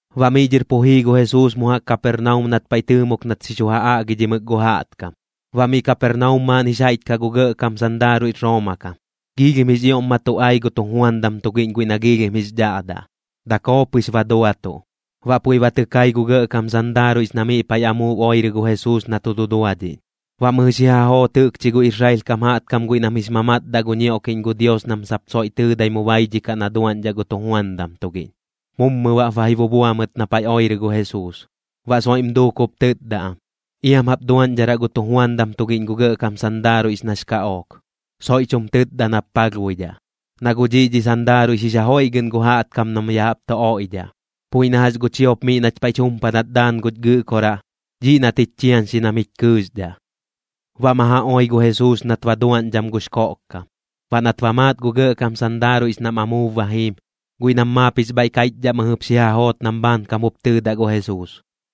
Baꞌ miꞌ dhɨr pu jii gu Jesuus mu jaꞌk Kapernaum nat paiꞌ tɨɨmok nat xi chu ja aꞌgidhimɨk gu jaꞌtkam. Baꞌ miꞌ Kapernaum maaꞌn jix jaiꞌch kaꞌ gu gɇꞌkam sandaaruiꞌx Rooma kam, giilhim jix ioꞌm ma tu ai gu tujuandam tugiꞌñ guiꞌ nax dhaꞌdaꞌ, dakoo pɨx ba duatuꞌ. Baꞌ puiꞌ ba tɨ kai gu gɇꞌkam sandaaruiꞌx na miꞌ paiꞌ amuub oirɨ gu Jesuus na tu duduadhiꞌñ, baꞌ mɨjɨ xi ja joot jɨꞌkchi gu Israel kam jaꞌtkam guiꞌ nam jix mamatdaꞌ gu ñioꞌkiꞌñ gu Dios nam sap soiꞌ tɨɨdai mu baidhikaꞌ na duaꞌñdhaꞌ gu tujuandam tugiꞌñ. Mummɨ baꞌp ba ji bubua mɨt na paiꞌ oirɨ gu Jesuus, baꞌ soiꞌm duuk jup tɨtda am: ―Iam jap duaꞌñdharaꞌ gu tujuandam tugiꞌñ gu gɇꞌkam sandaaruiꞌx nax kaꞌook, soiꞌch jum tɨtda nap palhbuidhaꞌ. Na guꞌ dhiꞌ dhi sandaaruiꞌx jix ja joiꞌgɨꞌn gu jaꞌtkam nam ya jaꞌp tu oiꞌdhaꞌ, puiꞌ na jax gu chiop miꞌ nach paiꞌch jumpadat daan guch Gɨꞌkoraꞌ, dhiꞌ nat jich chiañxi nam jich kɨɨxdhaꞌ. Baꞌ ma ja oi gu Jesuus nat ba duaꞌñdham gux koꞌkkam. Baꞌ nat ba maat gu gɇꞌkam sandaaruiꞌx nam amuub ba jiim, guiꞌ nam maap jix bhaiꞌ kaiꞌchdhaꞌ mɨjɨp xi ja joot nam bhaankam jup tɨɨdaꞌ gu Jesuus: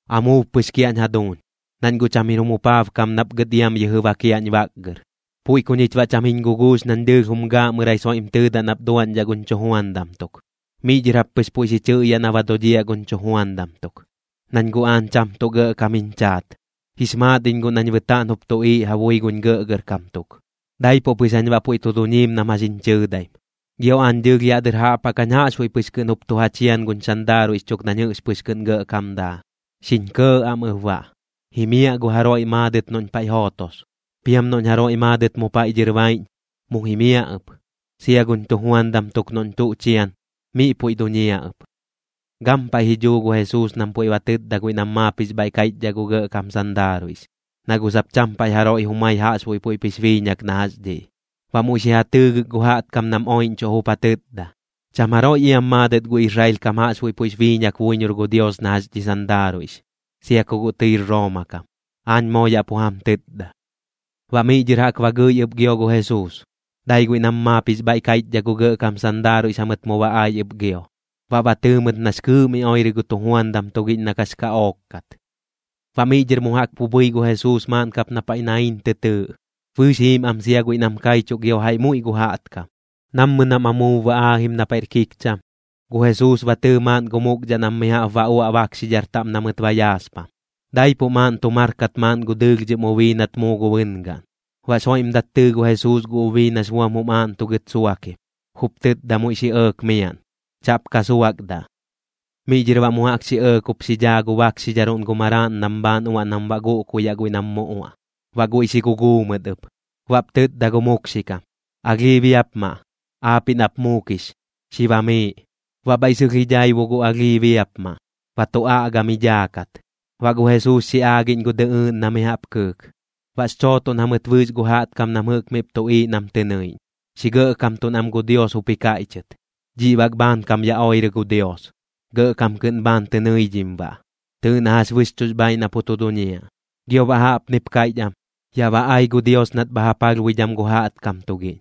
―Amuub pɨx kiaꞌñ jaduuñ, nañ gu cham jir jum jupaabkam nap gɨt iam yɨjɨ bakiaꞌñ baꞌgɨr. Puiꞌ ku ñich baꞌ cham jiñ guguux nañ dɨɨlh jum gaaꞌmɨrai soiꞌm tɨɨdaꞌ nap duaꞌñdhaꞌ guñ chujuandam tuk. Miꞌ dhɨr jap pɨx puiꞌ xi chɨꞌyaꞌ na ba dodhiaꞌ guñ chujuandam tuk. Nañ guꞌ aañ cham tuꞌ gɇꞌkam jiñ chaat, jix maat iñ guꞌ nañ bɨtaaꞌn jup tuꞌiiꞌ ja bui guñ gɇꞌgɇrkam tuk, daipuꞌ pɨx jañ baꞌ puiꞌ tu duñiim nam jax jiñ chɨɨdaim. Gio aañ dɨɨlh yaꞌ dɨr jaꞌp jaꞌk jañ jaꞌxbuiꞌ pɨx kɨꞌn jup tu ja chian guñ sandaaruiꞌx chuk nañ jɨꞌx pɨx kɨꞌn gɇꞌkam daa, xiñ kɇɇkɇꞌ am ɨp baꞌ. Jimiaꞌ gu jaroiꞌ maadɨt noꞌñ paiꞌ jootos, piam noꞌñ jaroiꞌ maadɨt mu paiꞌ dhɨr baiꞌñ, mu jimiaꞌ ɨp. Sia guñ chujuandam tuk noꞌñ tuꞌ chian, miꞌ puiꞌ duñiaꞌ ɨp. Baꞌ gampaiꞌ ji dhuu gu Jesuus nam puiꞌ ba tɨtda guiꞌ nam maap jix bhaiꞌ kaiꞌchdhaꞌ gu gɇꞌkam sandaaruiꞌx, na guꞌ sap cham paiꞌ jaroiꞌ jumai jaꞌxbuiꞌ puiꞌp jix biiñak na jax dhiꞌ. Baꞌ muiꞌ xi ja tɨɨgɨk gu jaꞌtkam nam oiꞌñchuꞌ jup ja tɨtda: ―Cham jaroiꞌ iam maadɨt gu Israel kam jaꞌxbuiꞌ puiꞌx biiñak buiñor gu Dios na jax dhi sandaaruiꞌx, sia ku guꞌ tɨir Rooma kam, aañ moo yaꞌ pu jam tɨtda. Baꞌ miꞌ dhɨr jaꞌk ba gɨi ɨp gio gu Jesuus. Dai guiꞌ nam maap jix bhaiꞌ kaiꞌchdhaꞌ gu gɇꞌkam sandaaruiꞌx jamɨt mu ba ai ɨp gio, baꞌ ba tɨɨ mɨt nax kɨɨꞌ mi oirɨ gu tujuandam tugiꞌñ na kax kaꞌook kat. Baꞌ miꞌ dhɨr mu jaꞌk pu bhɨi gu Jesuus maaꞌn kap na paiꞌ Naiin tɨ tɨɨꞌ, bɨɨx jiim am sia guiꞌ nam kaichuꞌ gio jaiꞌ muiꞌ gu jaꞌtkam. Nammɨ nam amuub ba aajim na paiꞌr kikcham, gu Jesuus ba tɨɨ maaꞌn gu mukdhaꞌ nam mi jaꞌp ba uaꞌ bakxidhar taꞌm na mɨt ba yaaspam. Daipuꞌ maaꞌn tu mar kat maaꞌn gu dɨlhdhɨm ubii nat muu gu bɨngaꞌn. Baꞌx joiꞌmdat tɨɨ gu Jesuus gu ubii nax buam jum aaꞌntugɨt suakim, jup tɨtda muiꞌ xi ɇɇk miaꞌn: ―Chaꞌp ka suakdaꞌ. Miꞌ dhɨr baꞌ mu jaꞌk xi ɇɇk jup xi dhaa gu bakxidharuꞌn gu maraaꞌn nam bhaan uaꞌ nam baꞌ guꞌkuyaꞌ guiꞌ nam mu uaꞌ. Baꞌ guiꞌ xi guguu mɨt ɨp. Baꞌp tɨtda gu mukxikam: ―Alhii biapmaꞌ, aapiꞌ nap muukix, xi bamiiꞌ. Baꞌ bhaiꞌ sɨlh ji dhaibu gu alhii biapmaꞌ, ba tu aꞌga mi dhaakat. Baꞌ gu Jesuus xi aagiꞌñ gu dɨꞌɨɨꞌn na mi jaꞌp kɨɨk. Baꞌx chootoꞌn jamɨt bɨɨx gu jaꞌtkam nam jɨꞌk miꞌp tuꞌiiꞌ nam tɨ nɨiꞌñ, xi gɇꞌkamtuꞌn am gu Dios jup ji kaiꞌchɨt: ―Dhiꞌ bak bhaankam ya oirɨ gu Dios, gɇꞌkam kɨꞌn bhaan tɨ nɨidhim baꞌ. Tɨɨꞌ na jax bɨxchuꞌx bhaaiꞌ na pu tu duñiaꞌ. Gio baꞌ jaꞌpnip kaiꞌch am: ―Yaꞌ ba ai gu Dios nat bha ja palhbuidham gu jaꞌtkam tugiꞌñ.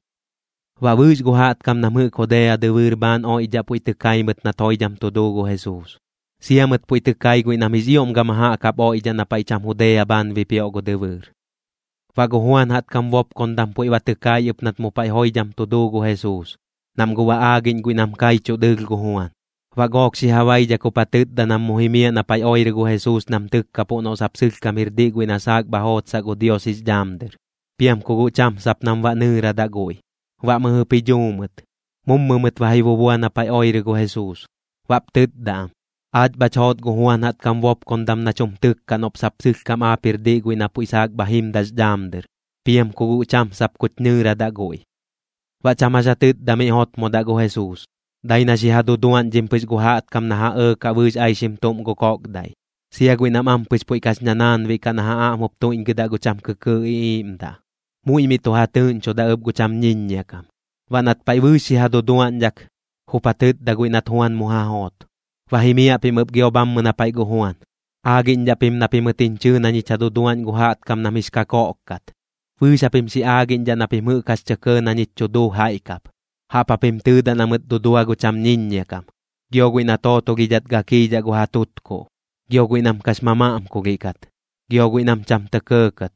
Baꞌ bɨɨx gu jaꞌtkam nam jɨꞌk Judea dɨbɨɨr bhaan oiꞌdhaꞌ puiꞌ tɨ kai mɨt nat joidham tu duu gu Jesuus, sia mɨt puiꞌ tɨ kai guiꞌ nam jix ioꞌm gama jaꞌk jaꞌp oiꞌdhaꞌ na paiꞌ cham Judea bhaan bipioꞌ gu dɨbɨɨr. Baꞌ gu Juan jaꞌtkam bopkondam puiꞌ ba tɨ kai ɨp nat mu paiꞌ joidham tu duu gu Jesuus, nam guꞌ ba aagiꞌñ guiꞌ nam kaiꞌchuꞌ dɨɨlh gu Juan. Baꞌ gook xi ja baidhak jup ja tɨtda nam mu jimiaꞌ na paiꞌ oirɨ gu Jesuus nam tɨkkapuꞌ noꞌ sap sɨlhkam jir diꞌ guiꞌ na saak bha jootsaꞌ gu Dios jix dhaam dɨr, piam ku guꞌ cham sap nam baꞌ nɨɨradaꞌ guiꞌ. Baꞌ mɨjɨp ji dhuu mɨt, mummɨ mɨt ba ji bubua na paiꞌ oirɨ gu Jesuus, baꞌp tɨtda am: ―Aach bhach joot gu Juan jaꞌtkam bopkondam nach jum tɨkkaꞌ noꞌp sap sɨlhkam aap jir diꞌ guiꞌ na puiꞌ saak bha jimdaꞌx dhaam dɨr, piam ku guꞌ cham sap kuch nɨɨradaꞌ guiꞌ. Baꞌ cham jax ja tɨtda miꞌ jotmodaꞌ gu Jesuus, dai na xi ja duduaꞌñdhim pɨx gu jaꞌtkam na ka ja ɇɇkaꞌ bɨɨx aixim tuꞌm gu koꞌkdaiꞌ, sia guiꞌ nam ampɨx puiꞌ kax ñanaanbiꞌ kaꞌ na ja aꞌm jup tuiꞌñgɨdaꞌ gu cham kɨkɨɨꞌ iꞌiiꞌmdaꞌ. Muiꞌ miꞌ tu ja tɨɨꞌñchoda ɨp gu cham ñiññia kam. Baꞌ nat paiꞌ bɨɨx xi ja duduaꞌñdhak, jup ja tɨtda guiꞌ nat Juan mu ja joot: ―Ba jimiaꞌ pim ɨp gio bhammɨ na paiꞌ gu Juan, aagiꞌñdhaꞌ pim na pimɨt jiñ chɨɨ na ñich ja duduaꞌñ gu jaꞌtkam nam jix kakoꞌk kat, bɨɨx japim xi aagiꞌñdhaꞌ na pim jɨꞌk jax tɇ kɇɇ na ñich chu duu jaiꞌ kap. Jaꞌp japim tɨɨdaꞌ na mɨt dudua gu cham ñiññia kam, gio guiꞌ na tootolhidhat gakiidhaꞌ gu ja tutkuꞌ, gio guiꞌ nam kax mamaꞌmkulhiꞌ kat, gio guiꞌ nam cham tɇ kɇɇkɇt.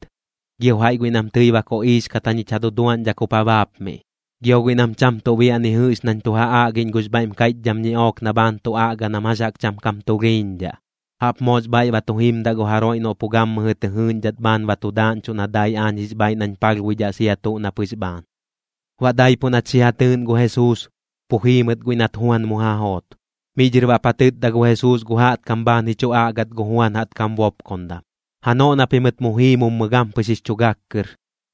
Gio jaiꞌ guiꞌ nam tɨi ba koꞌiix kat jañich ja duduaꞌñdhak jup ja baapmiꞌ. Gio guiꞌ nam cham tuꞌ biaꞌ ni jɨꞌx nañ tu ja aꞌgiꞌñ gux bhaiꞌm kaiꞌchdham ñiꞌook na bhaan tu aꞌga nam jax jaꞌk cham kam tulhiiñdhaꞌ. Jaꞌp moox bhaiꞌ ba tu jimdaꞌ gu jaroiꞌ noꞌ pu gammɨjɨ tɨ jɨɨꞌñdhat bhaan ba tu daaꞌñchuꞌ na dai aañ jix bhaaiꞌ nañ palhbuidhaꞌ sia tuꞌ na pɨx bhaan. Baꞌ daipuꞌ nat xi ja tɨɨꞌn gu Jesuus, pu jii mɨt guiꞌ nat Juan mu ja joot. Miꞌ dhɨr baꞌp ja tɨtda gu Jesuus gu jaꞌtkam bhaan ji chu aꞌgat gu Juan jaꞌtkam bopkondam: ―Janoꞌ na pimɨt mu jii mummɨ gampɨx jix chu gak kɨr,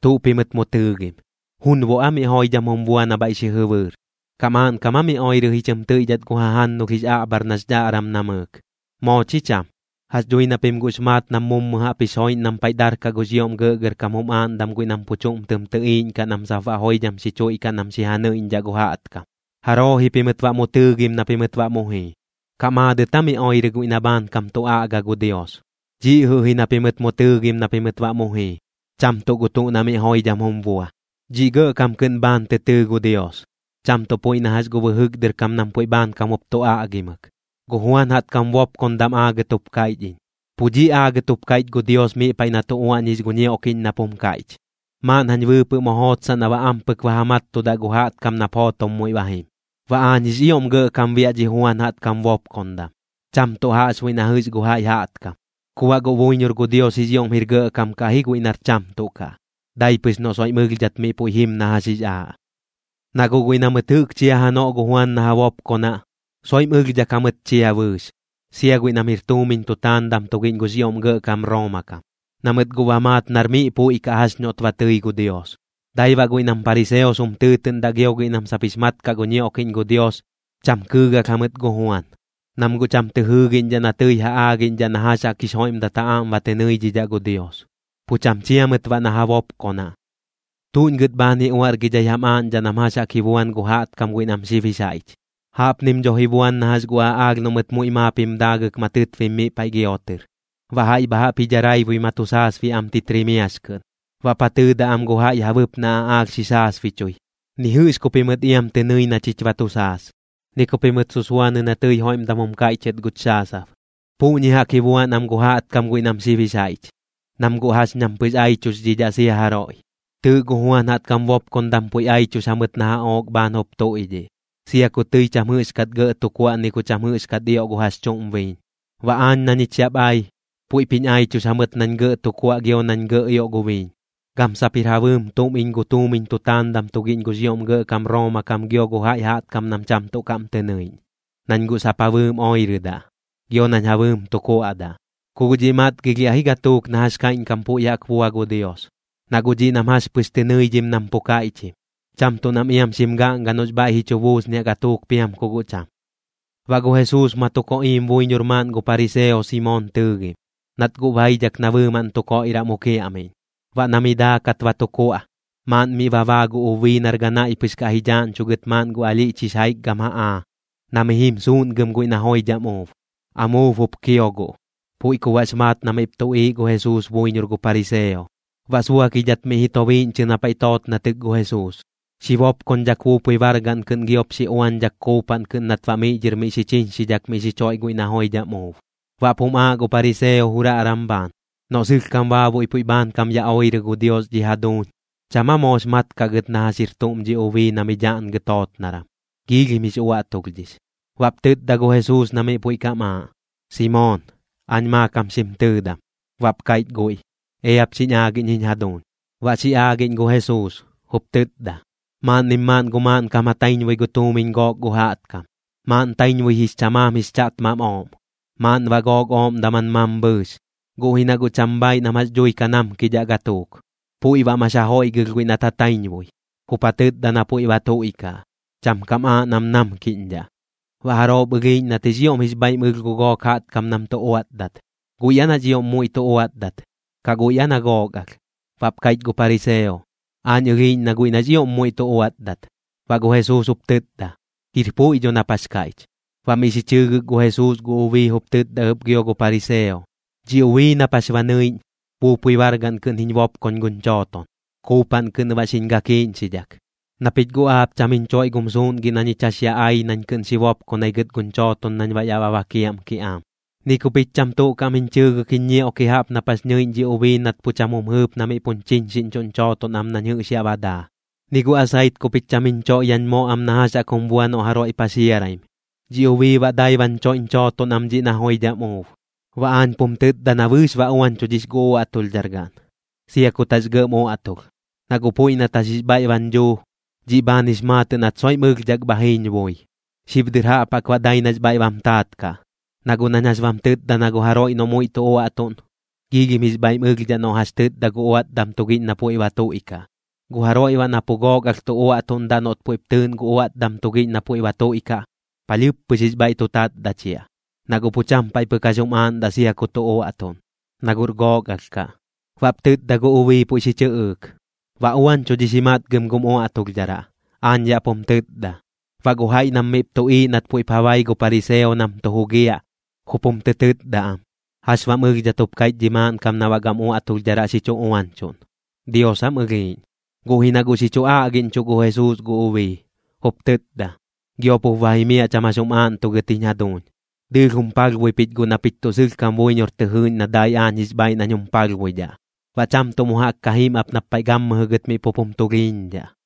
¿tuꞌ pimɨt mu tɨɨgim? ¿Junboꞌ aa miꞌ joidham jum bua na bhaiꞌ xi jɨbɨɨr? ¿Kaꞌ maaꞌnkam aa mi oirɨ ji chɨm tɨiꞌdhat gu jajannulh jix aꞌbhar nax dhaꞌram namɨɨk? Moo chi cham. Jax dhui na pim guꞌx maat nam mummɨ jaꞌp jix joiꞌñ nam paiꞌ darkaꞌ gux ioꞌm gɇꞌgɇrkam jum aaꞌndam guiꞌ nam pu chuꞌm tɨm tɨꞌiiꞌñkaꞌ nam sap baꞌ joidham xi chuiꞌkaꞌ nam xi ja nɨiꞌñdhaꞌ gu jaꞌtkam. ¿Jaroo ji pimɨt baꞌ mu tɨɨgim na pimɨt baꞌ mu jii? ¿Kaꞌ maadɨt aa mi oirɨ guiꞌ na bhaankam tu aꞌga gu Dios? Dhiꞌ jɨꞌ ji na pimɨt mu tɨɨgim na pimɨt baꞌ mu jii, cham tuꞌ gu tuꞌ na miꞌ joidham jum bua. Dhiꞌ gɇꞌkam kɨꞌn bhaan tɨ tɨɨ gu Dios, cham tuꞌ puiꞌ na jax gu bɨjɨk dɨr kam nam puiꞌ bhaankam jup tu aꞌgimɨk. Gu Juan jaꞌtkam bopkondam aagɨt jup kaiꞌch iñ. Pu dhiꞌ aagɨt jup kaiꞌch gu Dios miꞌ paiꞌ na tu uaꞌñix gu ñioꞌkiꞌñ nap jum kaiꞌch: “Maaꞌn jañ bɨɨpɨꞌ mu jootsaꞌ na baꞌ ampɨk ba ja mattudaꞌ gu jaꞌtkam nap jootom muiꞌ ba jim.” Baꞌ aañ jix ioꞌm gɇꞌkam biaꞌ dhi Juan jaꞌtkam bopkondam, cham tuꞌ jaꞌxbuiꞌ na jɨꞌx gu jaiꞌ jaꞌtkam. Ku baꞌ guꞌ buiñor gu Dios jix ioꞌm jir gɇꞌkam kaꞌ ji guiꞌ nar cham tuꞌ kaꞌ, dai pɨx noꞌ soiꞌm ɨlhdhat miꞌ puiꞌ jim na jax jix aaꞌ. ’Na guꞌ guiꞌ na mɨt jɨꞌk chia janoꞌ gu Juan na ja bopkonaꞌ, soiꞌm ɨlhdhak jamɨt chia bɨɨx, sia guiꞌ nam jir tuumiñ tutaandam tugiꞌñ gux ioꞌm gɇꞌkam Rooma kam, na mɨt guꞌ ba maat nar miꞌ puiꞌ kaꞌ jax noꞌt ba tɨi gu Dios. Dai baꞌ guiꞌ nam pariseos jum tɨɨtɨꞌndaꞌ gio guiꞌ nam sap jix mat kaꞌ gu ñioꞌkiꞌñ gu Dios, cham kɨɨgalh jamɨt gu Juan, nam guꞌ cham tɨ jɨɨgiꞌñdhaꞌ na tɨi ja aagiꞌñdhaꞌ na jax jaꞌk jix joiꞌmdat ja aꞌm ba tɨ nɨidhidhaꞌ gu Dios, pu cham chia mɨt baꞌ na ja bopkonaꞌ. ’¿Tuꞌñ gɨt bhaan ji uaꞌrgidhai jam aaꞌñdhaꞌ nam jax jaꞌk ji buan gu jaꞌtkam guiꞌ nam xib jix jaiꞌch? Jaꞌpnim dho ji buan na jax gu aꞌaalh noꞌ mɨt muiꞌ maap jim daagɨk ma tɨtbim miꞌ paiꞌ giotɨr. Baꞌ jaiꞌ bha jaꞌp ji daraibui ma tu saasbiaꞌ am titrimiax kɨꞌn, baꞌp ja tɨɨdaꞌ am gu jaiꞌ ja bɨpnaꞌ aꞌaalh xi saasbichui: “Ni jɨꞌx ku pimɨt iam tɨ nɨi na chich ba tu saas, ni ku pimɨt susuanɨ na tɨi joiꞌmdam jum kaiꞌchɨt guch xaasab.” Puꞌñi jaꞌk ji buan am gu jaꞌtkam guiꞌ nam xib jix jaiꞌch, nam guꞌ jax ñam pɨx aichuxdhidhaꞌ sia jaroiꞌ. Tɨɨꞌ gu Juan jaꞌtkam bopkondam puiꞌ aichux jamɨt na jaꞌook bhaan jup tuiꞌdhiꞌ, sia ku tɨi cham jɨꞌxkat gɇꞌ tu kuaꞌ ni ku cham jɨꞌxkat ioꞌ gu jax chuꞌm biiñ. Baꞌ aañ na ñich yaꞌp ai, puiꞌp jiñ aichux jamɨt nañ gɇꞌ tu kuaꞌ gio nañ gɇꞌ ioꞌ gu biiñ. Gam sap jir ja bɨɨm tuꞌm iñ gu tuumiñ tutaandam tugiꞌñ gux ioꞌm gɇꞌkam Rooma kam gio gu jaiꞌ jaꞌtkam nam cham tuꞌ kaꞌm tɨ nɨiꞌñ, nañ guꞌ sap ja bɨɨm oirɨdaꞌ, gio nañ ja bɨɨm tu kuaꞌdaꞌ. Ku guꞌ dhiꞌ matgilhiaꞌ ji gatuuk na jax kaiꞌñkam puiꞌ jaꞌk bua gu Dios, na guꞌ dhiꞌ nam jax pɨx tɨ nɨidhim nam pu kaiꞌchim, cham tuꞌ nam iam xim gaꞌnga noꞌx bhaiꞌ ji chu buusniaꞌ gatuuk piam ku guꞌ cham. Baꞌ gu Jesuus ma tu koꞌiim buiñor maaꞌn gu pariseo Simoon tɨɨgim, nat guꞌ baidhak na bɨɨmaꞌn tu koiꞌraꞌ mu kiaꞌmiꞌñ. Baꞌ na miꞌ daakat ba tu kuaꞌ, maaꞌn miꞌ ba baa gu ubii nar ganaiꞌ pɨx kaꞌ ji dhaaꞌñchugɨt maaꞌn gu alhiꞌch jix jaikgam jaꞌaa, na mi jim suuꞌngɨm guiꞌ na joidham uub. Amuub jup kio guꞌ, puiꞌ ku baꞌx maat na miꞌp tuꞌiiꞌ gu Jesuus buiñor gu pariseo. Baꞌ suakidhat miꞌ ji tobiiꞌñchɨ na paiꞌ tootnatɨk gu Jesuus, xi bopkoñdhak buupui bargaꞌn kɨꞌn giop xi uañdhak kuupaꞌn kɨꞌn nat baꞌ miꞌ dhɨr miꞌ xi chiñxidhak miꞌ xi choiꞌ guiꞌ na joidham uub. Baꞌp jum aaꞌ gu pariseo juraꞌram bhaan: “Noꞌ sɨlhkam baabuiꞌ puiꞌ bhaankam ya oirɨ gu Dios dhi jaduuñ, ¿cham aa moox mat kaꞌ gɨt na jax jir tuꞌm dhi ubii na mi dhaꞌngɨ tootnaram? Giilhim jix uaꞌtulhdhix.” Baꞌp tɨtda gu Jesuus na miꞌ puiꞌ kam aaꞌ: ―Simoon, aañ maakam xim tɨɨdam. Baꞌp kaiꞌch guiꞌ: ―Eap xiñ aagiꞌñ jiñ jaduuñ. Baꞌ xi aagiꞌñ gu Jesuus, jup tɨtda: ―Maaꞌnnim maaꞌn gu maaꞌnkam ja taiñbui gu tuumiñ gook gu jaꞌtkam, maaꞌn taiñbui jix chamaam jix chaꞌtmam ooꞌm, maaꞌn baꞌ gook ooꞌm daman mambhɨɨx. Guꞌ ji na guꞌ cham bhaaiꞌ nam jax dhui ka namkidhaꞌ gatuuk, puiꞌ baꞌ max ja joiꞌgɨlh guiꞌ nat ja taiñbui, jup ja tɨtda na puiꞌ ba tuiꞌkaꞌ, cham kam aaꞌ nam namkiꞌñdhaꞌ. ¿Baꞌ jaroop ɨlhiiꞌñ nat jix ioꞌm jix bhaiꞌm ɨlh gu gook jaꞌtkam nam tu uaꞌtdat, guiꞌ aa nax ioꞌm muiꞌ tu uaꞌtdat, kaꞌ guiꞌ aa na gook alh? Baꞌp kaiꞌch gu pariseo: ―Aañ ɨlhiiꞌñ na guiꞌ nax ioꞌm muiꞌ tu uaꞌtdat. Baꞌ gu Jesuus jup tɨtda: ―Jir puiꞌ dho nap jax kaiꞌch. Baꞌ miꞌ xi chɨɨgɨk gu Jesuus gu ubii jup tɨtda ɨp gio gu pariseo: ―Dhi ubii nap jax ba nɨiꞌñ, buupui bargaꞌn kɨꞌn jiñ bopkoñ guñ chooton, kuupaꞌn kɨꞌn baꞌ xiñ gakiiꞌñxidhak. Na pich guꞌ aap cham jiñ choiꞌ gum suuꞌngiꞌ na ñich jax ya ai nañ kɨꞌn xi bopkonai gɨt guñ chooton nañ baꞌ yaꞌ ba bakiaꞌm kiꞌaam. Ni ku pich cham tuꞌ kaꞌm jiñ chɨɨdak jiñ ñioꞌki jaꞌp nap jax nɨiꞌñ dhi ubii nat pu cham jum jɨɨp na miꞌ puñ chiñxiꞌñchuꞌñ chooton am nañ jɨꞌx yaꞌ ba daa. Ni gu asait ku pich cham jiñ choiꞌ yaꞌñ moꞌ am na jax jaꞌk jum bua noꞌ jaroiꞌ paxiaraim, dhi ubii baꞌ dai bañ choiꞌñ chooton am dhiꞌ na joidham uub. Baꞌ aañ pum tɨtda na bɨɨx ba uañchudhix gu uaꞌtulhdhar gaꞌn, sia kut jax gɇꞌm uaꞌtulh, na guꞌ puiꞌ nat jax jix bhaiꞌ bañ dhuu, dhiꞌ bhaan jix maatɨꞌ nat soiꞌm ɨlhdhak bha jiiñ bui. Xib dɨr jaꞌp jaꞌk baꞌ dai nax bhaiꞌ bam taat kaꞌ, na guꞌ nañ jax bam tɨtda na gu jaroiꞌ noꞌ muiꞌ tu uaꞌtuꞌn, giilhim jix bhaiꞌm ɨlhdhaꞌ noꞌ jax tɨtda gu uaꞌtdam tugiꞌñ na puiꞌ ba tuiꞌkaꞌ. Gu jaroiꞌ baꞌ na pu gook alh tu uaꞌtuꞌndaꞌ noꞌt puiꞌp tɨɨꞌn gu uaꞌtdam tugiꞌñ na puiꞌ ba tuiꞌkaꞌ, palhɨɨp pɨx jix bhaiꞌ tu tatdachiaꞌ, na guꞌ pu cham paiꞌ pɨk jax jum aaꞌndaꞌ sia ku tu uaꞌtuꞌn, na guꞌr gook alh kaꞌ. Baꞌp tɨtda gu ubii puiꞌ xi chɨꞌɨɨk: ―Ba uañchudhix ji matgɨm gum uaꞌtulhdharaꞌ, aañ yaꞌ pum tɨtda. Baꞌ gu jaiꞌ nam miꞌp tuꞌiiꞌ nat puiꞌp ja bai gu pariseo nam tu jugiaꞌ, jup jum tɨ tɨtda am: ―¿Jax baꞌm ɨlhdhat jup kaiꞌch dhi maaꞌnkam na baꞌ gam uaꞌtulhdharaꞌ xi chu uañchuꞌn? ¿Dios aam ɨlhiiꞌñ? Guꞌ ji na guꞌ xi chu aꞌgiꞌñchuꞌ gu Jesuus gu ubii, jup tɨtda: ―Giop jup ba jimiaꞌ cham jax jum aagɨt jiñ jaduuñ. Dɨɨlh jum palhbui pich guꞌ na pich tuꞌ sɨlhkam buiñor tɨ jɨɨꞌñ na dai aañ jix bhaaiꞌ nañ jum palhbuidhaꞌ. Baꞌ cham tuꞌ mu jaꞌk ka jim ap nap paiꞌ gammɨjɨ gɨt miꞌ pup jum tulhiiñdhaꞌ.